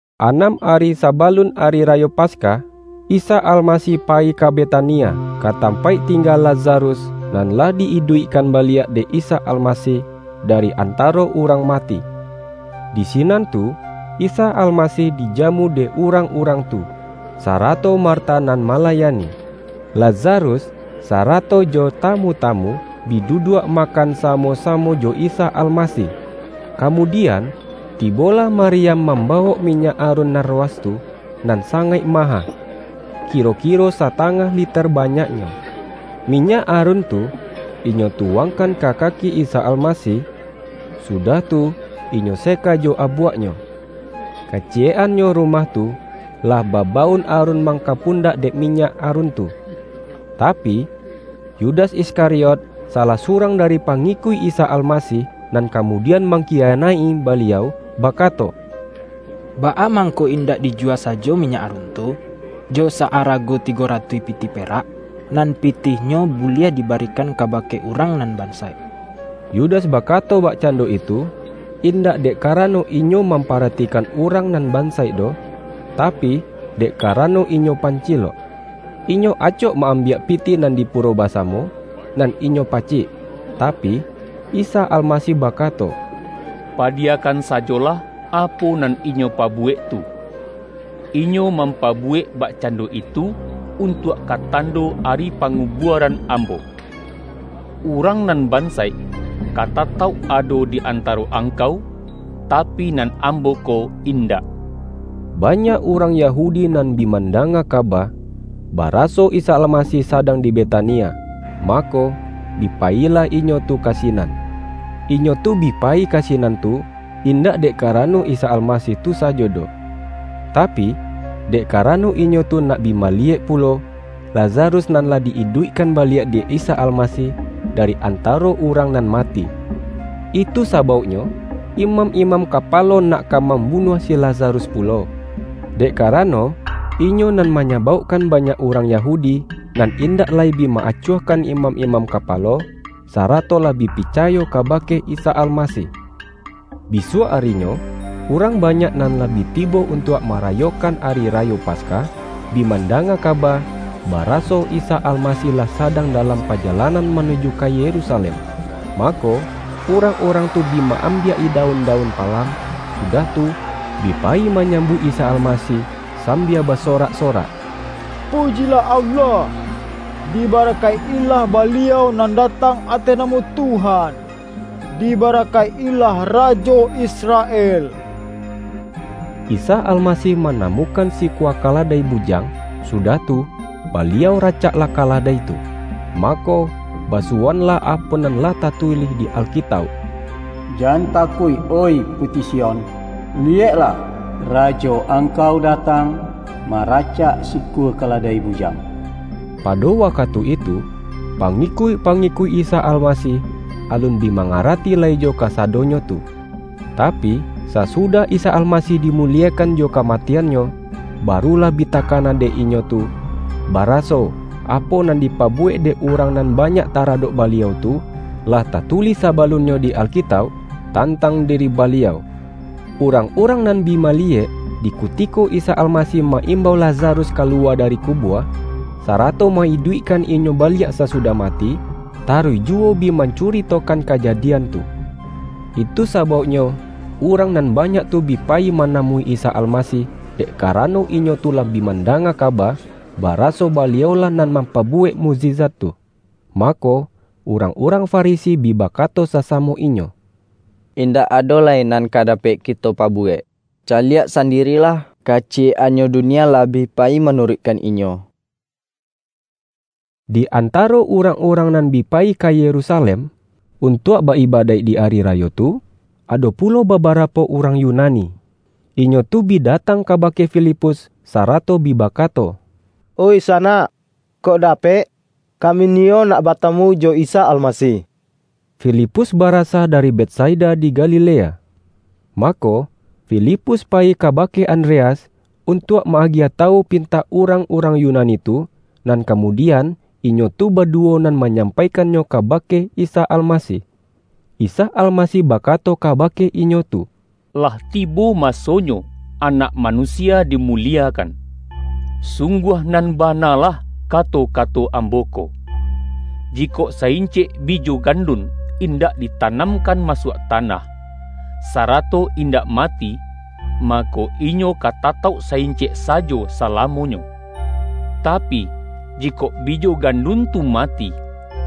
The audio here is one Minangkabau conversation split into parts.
Anam ari sabalun Ari Rayo Pas-kah, Isa Almasih payi ka Beta-nia, ka tampaik tingga Lazarus, nan lah di-iduikkan baliak dek Isa Almasih da-ri antaro urang mati. Di sinan tu, Isa Almasih dijamu dek urang-urang tu, sa-rato Marta nan malayani. Lazarus, sara-to jo tamu-tamu, bi duduak makan sa-mo-samo jo Isa Almasih. Kamudian, tibolah Maryam mambawok minyak arun narwastu nan sangaik maha, kiro-kiro satangah liter banyaknyo. Mi-nyak arun tu, inyo tuwangkan ka ka-ki Isa Almasih, sudah tu, inyo seka jo abuaknyo. Kaciyek-annyo rumah tu, lah babaun arun mangkapundak dek minyak arun tu. Tapi, Yudas Iskari-ot, salah surang dari pangikuik Isa Al-masih — nan kamudian mangkiyanaik-i Baliau — bakato, ”Baa mangko indak dijuwa sajo minyak arun tu, jo sa-ara-go tigo ratuih pitih perak, nan pitih-nyo buliah dibarikan kabake urang nan bansaik?” Yudas bakato bakcan-do itu, indak dek karano inyo mampa-ratikan urang nan bansaik doh, tapi, dek karano inyo pancilok. Inyo acok ma-ambiak pitih nan di puro basamo nan inyo pacik. Tapi, Isa Almasih bakato,”Padiya-kan sajolah, apo nan inyo pabuwek tu! Inyo mampabuwek bakcando itu, un-tuak ka tando ari pangubuaran Ambo. Urang nan bansaik, ka tatauk ado di antaro angkau, tapi, nan Ambo ko indak.” Banyak urang Yahudi nan bi manda-nga kaba, baraso Isa Almasih sadang di Betania, mako, bi payilah inyo tu ka si-nan. Inyo tu bi payi ka sinan tu, indak dek karano Isa Almasih tu sajo doh, tapi, dek karano inyo tu nak bi maliyek pulo, Lazarus nan lah di-iduikkan baliak dek Isa Almasih dari antaro urang nan ma-ti. Itu sabauknyo, imam-imam kapa-lo nak ka mambunuah si Lazarus pulo, dek karano, inyo nan manyabaukkan banyak urang Yahudi, nan indak lai bi ma-acuahkan imam-imam kapalo, sara-to lah bi picayo kabake Isa Almasih. Bisuak arinyo, urang banyak nan lah bi tibo untuak marayokan Ari Ra-yo Paskah, bi mandanga kaba, bara-so Isa Almasih lah sadang dalam paja-lanan manuju ka Yerusalem. Mako, urang-urang tu bi maambiak-i daun-daun palam, sudah tu, bi payi manyam-buik Isa Almasih sambia basorak-so-rak,”Pujilah Allah! Dibarakaik-ilah Baliau nan datang ateh namo Tuhan. Dibarakaik-ilah Rajo Israel!” Isa Almasih manamukan sikua ka-ladai bujang, sudah tu, Baliau racak-lah kaladai tu. Mako, basuwoanlah apo nan lah tatulih di Alkitauk: ”Jan takuik, oih puti Sion! Liyeklah, Rajo angkau datang, maracak sikua kaladai bujang!” Pado wakatu itu, pangikuik-pa-ngikuik Isa Almasih alun bi manga-rati lai jo kasadonyo tu. Tapi, sasudah Isa Almasih dimuliekan jo kamatian-Nyo, barulah bi takana dek inyo tu, baraso, apo nan dipabuwek dek urang nan banyak taradok Baliau tu, lah ta-tulih sabalunnyo di Alkitauk tantang diri Baliau. Urang-urang nan bi maliyek, di kutiko Isa Almasih ma-imbau Lazarus kaluwa dari kubua, sarato ma-iduikkan inyo baliak sasudah mati, taruih juwo bi mancuritokan kajadian tu. Itu sa-bauknyo urang nan banyak tu bi pa-yi manamui Isa Almasih, dek karano, inyo tu lah bi mandanga kaba, baraso Baliau-lah nan mampabuwek mukjizat tu. Mako, urang-urang Farisi bi ba-kato sasamo inyo,”Indak ado lai nan ka dapek kito pabuwek! Caliak sandi-rilah, kaciyek-annyo dunia lah bi pa-yi manuruikkan Inyo!” Di antaro urang-urang nan bi pa-yi ka Yerusalem, untuak ba-ibadaik di ari rayo tu, ado pulo babarapo urang Yunani. Inyo tu bi datang kabake Filipus, sarato bi bakato,”Oi sanak, kok dapek, kami niyo nak batamu jo Isa Almasih.” (Filipus barasa dari Bet-saida di Galilea.) Mako, Filipus payi kabake Andreas, untuak ma-agiah tawu pintak urang-urang Yunani tu, nan kamudian, inyo tu baduwo nan manyampaikannyo kabake Isa Almasih. Isa Almasih bakato ka-bake inyo tu,”Lah tibo masonyo Anak Manusia dimuliekan. Sungguah, nan bana lah kato-kato Ambo ko: Jikok sa-incek bijo gandun indak ditanamkan masuak tanah, sarato indak mati, mako, inyo ka tatauk sa-incek sajo salamonyo. Tapi, jikok bijo gandun tu mati,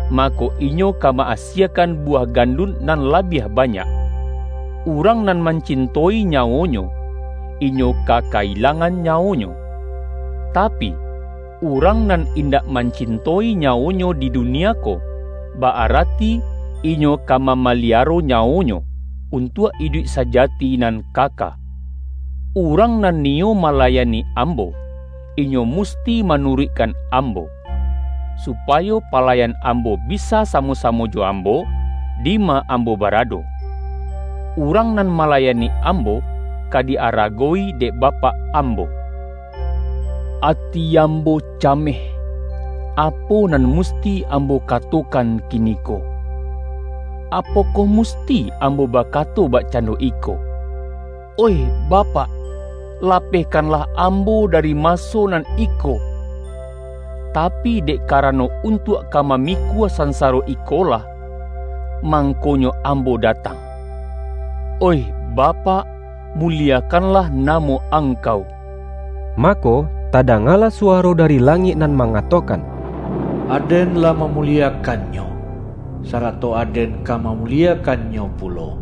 mako inyo ka ma-asiekan buwah gandun nan labiah banyak. Urang nan mancin-toi nyawonyo, inyo ka ka-ilangan nya-wonyo. Tapi, urang nan indak mancin-toi nyawonyo di dunia ko, ba-arati inyo ka mamaliaro nyawonyo, untuak iduik sajati nan kaka. Urang nan niyo ma-layani Ambo, inyo musti manuruikkan Ambo. Supayo palayan Ambo bisa sa-mo-samo jo Ambo, dima Ambo bara-do. Urang nan malayani Ambo, ka di-aragowi dek Bapak Ambo.” ”Ati Ambo cameh, apo nan musti Ambo katokan kiniko? Apokoh mus-ti Ambo bakato bakcando iko, ’Oih Bapak, lapehkanlah Ambo dari maso nan iko'? Tapi, dek karano untuak ka mamikua sansaro ikolah, mangkonyo Ambo datang. Oih Bapak muliekan-lah namo Angkau!” Mako, tadangalah suwaro dari langik nan mangatokan,”Aden lah mamuliekan-Nyo, sarato Aden ka mamuliekan-Nyo pulo.”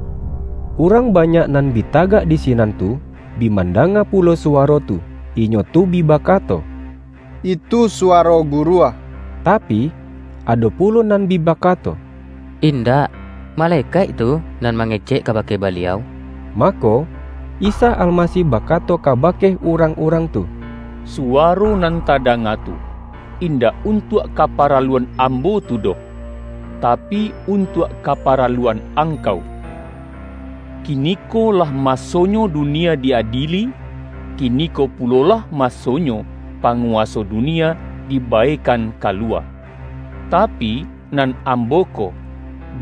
Urang banyak nan bi tagak di si-nan tu, bi mandanga pulo suwaro tu. Inyo tu bi bakato,”Itu suwaro guruah!” Tapi, ado pulo nan bi bakato,”Indak! Malekaik tu nan mangecek kabake Baliau!” Mako, Isa Almasih bakato kabake urang-urang tu,”Suwaro nan tadanga tu, indak untuak kaparaluan Ambo tu doh, tapi, untuak kaparaluan angkau. Kiniko lah masonyo dunia di-adieli, kiniko pulolah masonyo panguwaso du-nia dibaekan kaluwa. Tapi, nan Ambo ko,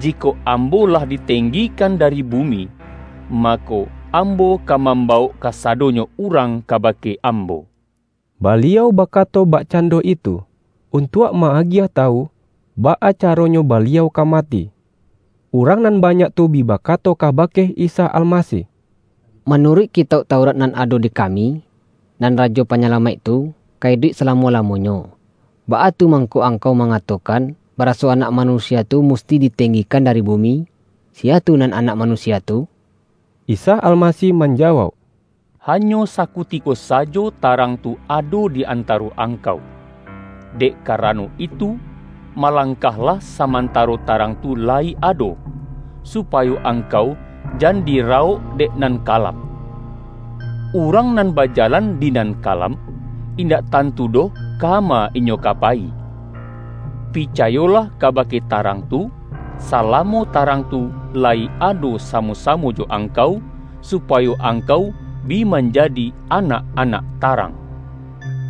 jikok Ambo lah ditenggikan dari bu-mi, mako, Ambo ka mambawok kasa-donyo urang kabake Ambo.” Baliau bakato bakcando itu, untuak ma-agiah tawu, baa caronyo Baliau ka mati. Urang nan banyak tu bi bakato ka-bake Isa Almasih,”Manuruik Kitauk Taurat nan ado di kami, nan Rajo Pa-nyalamaik tu, ka iduik salamo-lamo-nyo. Baa tu mangko Angkau manga-tokan, baraso Anak Manusia tu musti ditenggikan dari bumi? Siya tu nan Anak Manusia tu?” Isa Almasih manjawauk,”Hanyo sakutiko sajo, tarang tu ado di antaro angkau. Dek karano itu, malangkah-lah samantaro tarang tu layi ado, su-payo angkau jan dirawok dek nan ka-lam. Urang nan bajalan di nan kalam, indak tantu doh kama inyo ka payi. Picayolah kabake tarang tu, salamo tarang tu layi ado samo-samo jo ang-kau, supayo angkau bi manjadi anak-anak tarang.”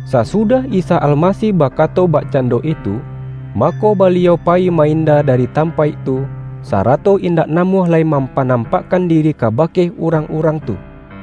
Sasudah Isa Almasih bakato bakcan-do itu, mako Baliau payi ma-inda da-ri tampaik tu, sarato indak namuah lai mampanampakkan diri kabake urang-urang tu.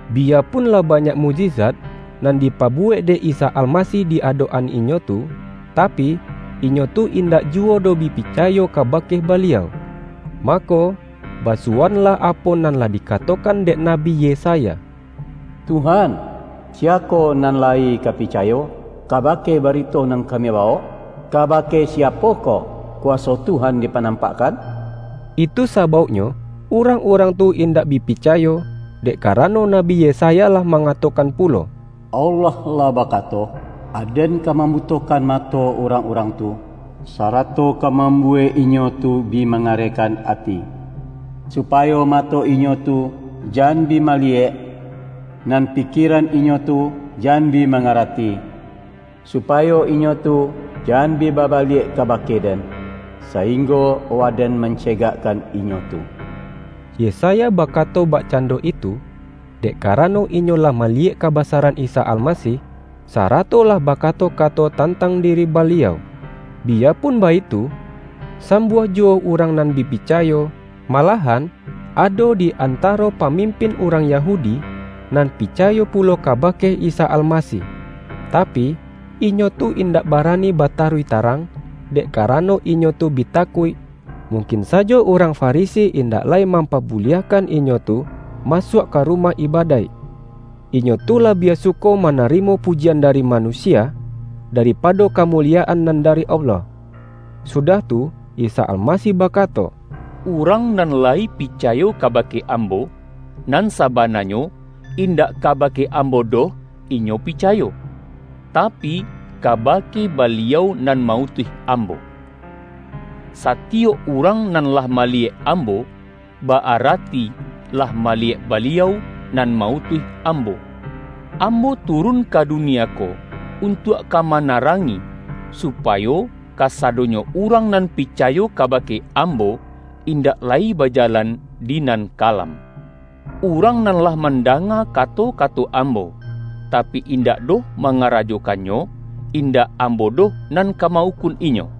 Biyapun lah ba-nyak mukjizat, nan dipabuwek dek Isa Almasih di adok-an inyo tu, tapi, inyo tu indak juwo doh bi picayo kabake Baliau. Mako, basuwoanlah apo nan lah dikatokan dek Nabi Yesaya,”Tuhan, siyakoh nan layi ka picayo kabake barito nan kami bawok? Kabake siapokoh kuwaso Tuhan dipanampakkan?” Itu sabauknyo urang-urang tu in-dak bi picayo, dek karano Nabi Yesa-ya lah mangatokan pulo,”Allah lah bakato, ’Aden ka mambutokan mato urang-urang tu, sarato ka mambuwek inyo tu bi mangarehkan ati. Supayo mato inyo tu jan bi maliyek, nan pikieran inyo tu jan bi mangarati. Supayo inyo tu jan bi babaliak kabake-Den, sainggo Waden mancegakkan inyo tu.’” Yesaya bakato bakcando itu, dek karano inyo lah maliyek kabasaran Isa Almasih, sarato lah bakato-kato tantang diri Baliau. Biyapun baitu, sambuah juwo urang nan bi picayo, malahan ado di antaro pamimpin urang Yahudi, nan picayo pulo kabake Isa Almasih. Ta-pi, inyo tu indak barani bataruih ta-rang, dek karano inyo tu bi takuik, mungkin sajo urang Farisi indak lai mampabuliahkan inyo tu masuak ka rumah ibadaik. Inyo tu labiah suko manarimo pujian dari manusia, dari-pado kamuliyaan nan dari Allah. Sudah tu, Isa Almasih bakato,”Urang nan layi picayo kabake Ambo, nan sabananyo, indak kabake Ambo doh inyo picayo, tapi, kabake Baliau nan ma-utuih Ambo. Satiyok urang nan lah maliyek Ambo, ba-arati lah maliyek Baliau nan ma-utuih Ambo. Ambo turun ka dunia ko untuak ka manarangi, supayo kasadonyo urang nan picayo kabake Ambo, indak lai bajalan di nan kalam. Urang nan lah mandanga kato-kato Ambo, tapi, indak doh mangarajokannyo indak Ambo doh nan ka ma-ukun inyo.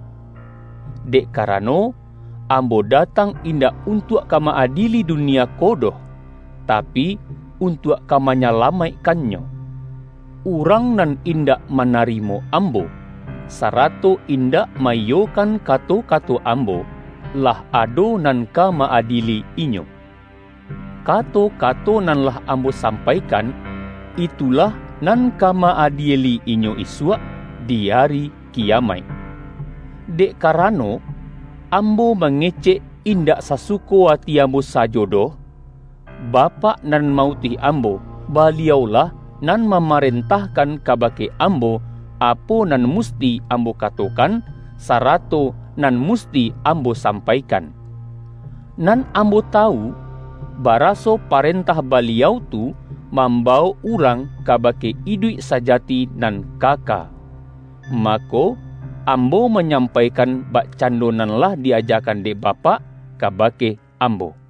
Dek karano, Ambo datang indak untuak ka ma-adieli dunia ko doh, tapi, untuak ka manyalamaikkannyo. Urang nan indak manarimo Ambo, sarato indak ma-iyokan kato-kato Ambo, lah ado nan ka ma-adieli-inyo. Kato-kato nan lah Ambo sampaikan, itulah nan ka ma-adieli-inyo isuak di Ari Kiyamaik. Dek karano, Ambo mangecek in-dak sasuko ati Ambo sajo doh. Bapak nan ma-utuih Ambo, Baliau-lah nan mamarentahkan kabake Ambo, apo nan musti Ambo katokan, sarato nan musti Ambo sampaikan. Nan Ambo tawu, baraso parentah Baliau tu, mam-bawok urang kabake iduik sajati nan kaka. Mako, Ambo manyampaikan bakcando nan lah di-ajakan dek Ba-pak kabake Ambo.” YAHYA